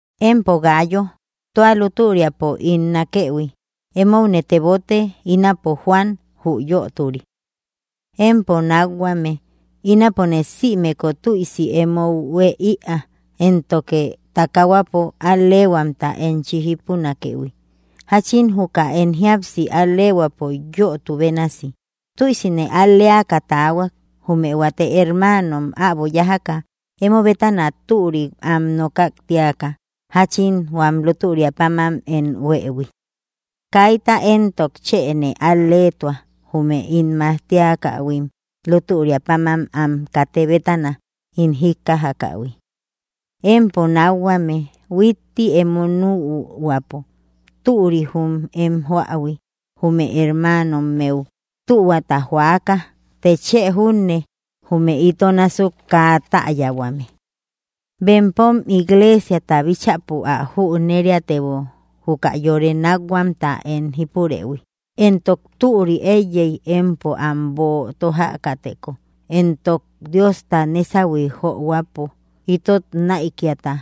Empo Gáayo, tua lútüriapo ín nákëhui, émoune tebote, ínapo Juan, jü yöturi. Empo nákhuame, ínapone sïmeku tüisi emou huée ïa éntoke takahuapo al‑lehuamta enchi jípunakëhui, jachin juka em jíapsi al‑lehuäpo yötu bénasi. Tüisine al‑leaka taahuak, jume huate hermaanom äbo yájaka emo bétana türik am nokak tíaka, jáchin huam lútüria páman em huëhui. Kaita éntok chë nee al‑leetua, jume ín majtiakähuim lútüria páman am katë bétana ín jíkkajähui. Empo nákhuame, huitti emo nühuäpo türi jum em joähui, jume hermaanommeu tühuata joäka, të chë junne jume ito násuk kaa täyahuame. Bempom iglesiata bíchäpo ä jüneriatebo juka yore nakhuamta em jípurëhui, entok türi eiyey empo am böo tójakäteko, entok Diosta nesahui johuäpo itot näikiata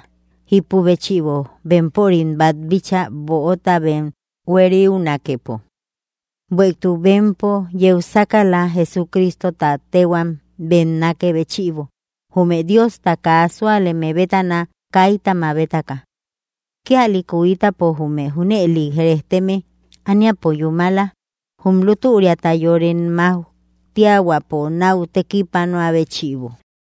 jípu béchïbo bempörim bat bíchaa böota bem hueriunakepo. Bueïtuk bempo yeu sákala Jesucristota téhuam bem nakë béchïbo, jume Diosta kaa súaleme bétana kaita mabetaka. Kíalïku ítapo jume junëli rejteme aníapo yúmala, jum lútüriata yore majtiahuäpo náu tekipanoä béchïbo.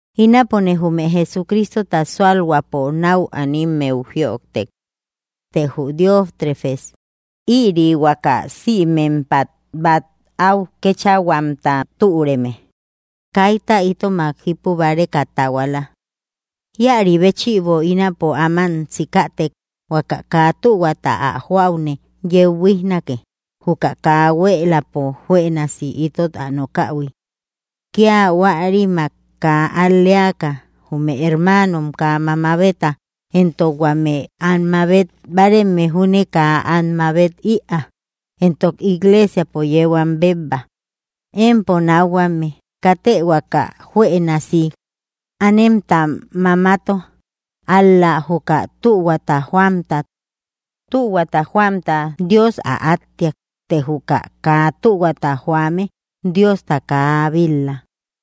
Ínapone jume Jesucristota súalhuäpo nau animmeu jïojtek, të jü Diótrefes, ïri huaka sïmempat bát au kechahuamta türeme, kayta itomak jipübareka tahuala. Ïari béchïbo, ínapo áman sikätek, huaka kaa tühuata ä joäune yeu buíjnake, juka kaa huéeläpo juënasi itot ä nokähui. Kía huärimak kaa al‑leaka, jume hermaanom kaa mamabeta, éntok huame am mabet báareme júne kaa am mabet ïaa. Entok iglesiapo yeu am bebba. Empo nákhuame, katë huaka juënasi anemta mamato, ál‑la juka tühuata joamta. Tühuata joamta Dios ä áttiak. Të jü kaa tühuata joame, Diosta kaa bil‑la.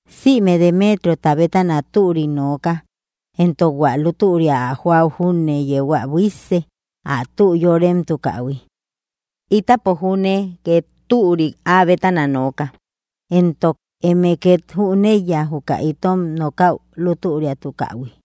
Sïme Demetriota bétana türik nooka, éntok hua lútüria ä joäu júne yeu ä buísse, ä tü yóremtukähui. Ítapo júne két türik áa bétana nooka, éntok eme ket jüneiya juka itom nokäu lútüriatukähui.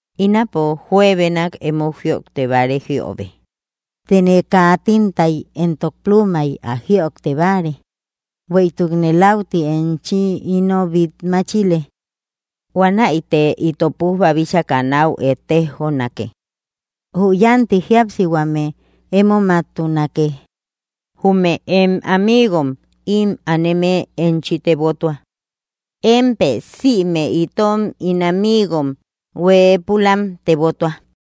Ínapo juebenak emou jïojte báare jiöbe, tene kaa tintay entok plumay ä jïojte báare, bueïtukne läuti enchi ino bít máchile. Huanäite ito pujba bíchaka náu ettejonake. Jü yanti jíapsihuame émomaktunake. Jume em amigom ím aneme enchi tebotua. Émpë sïme itom ín amigom hueepulam tebotuä.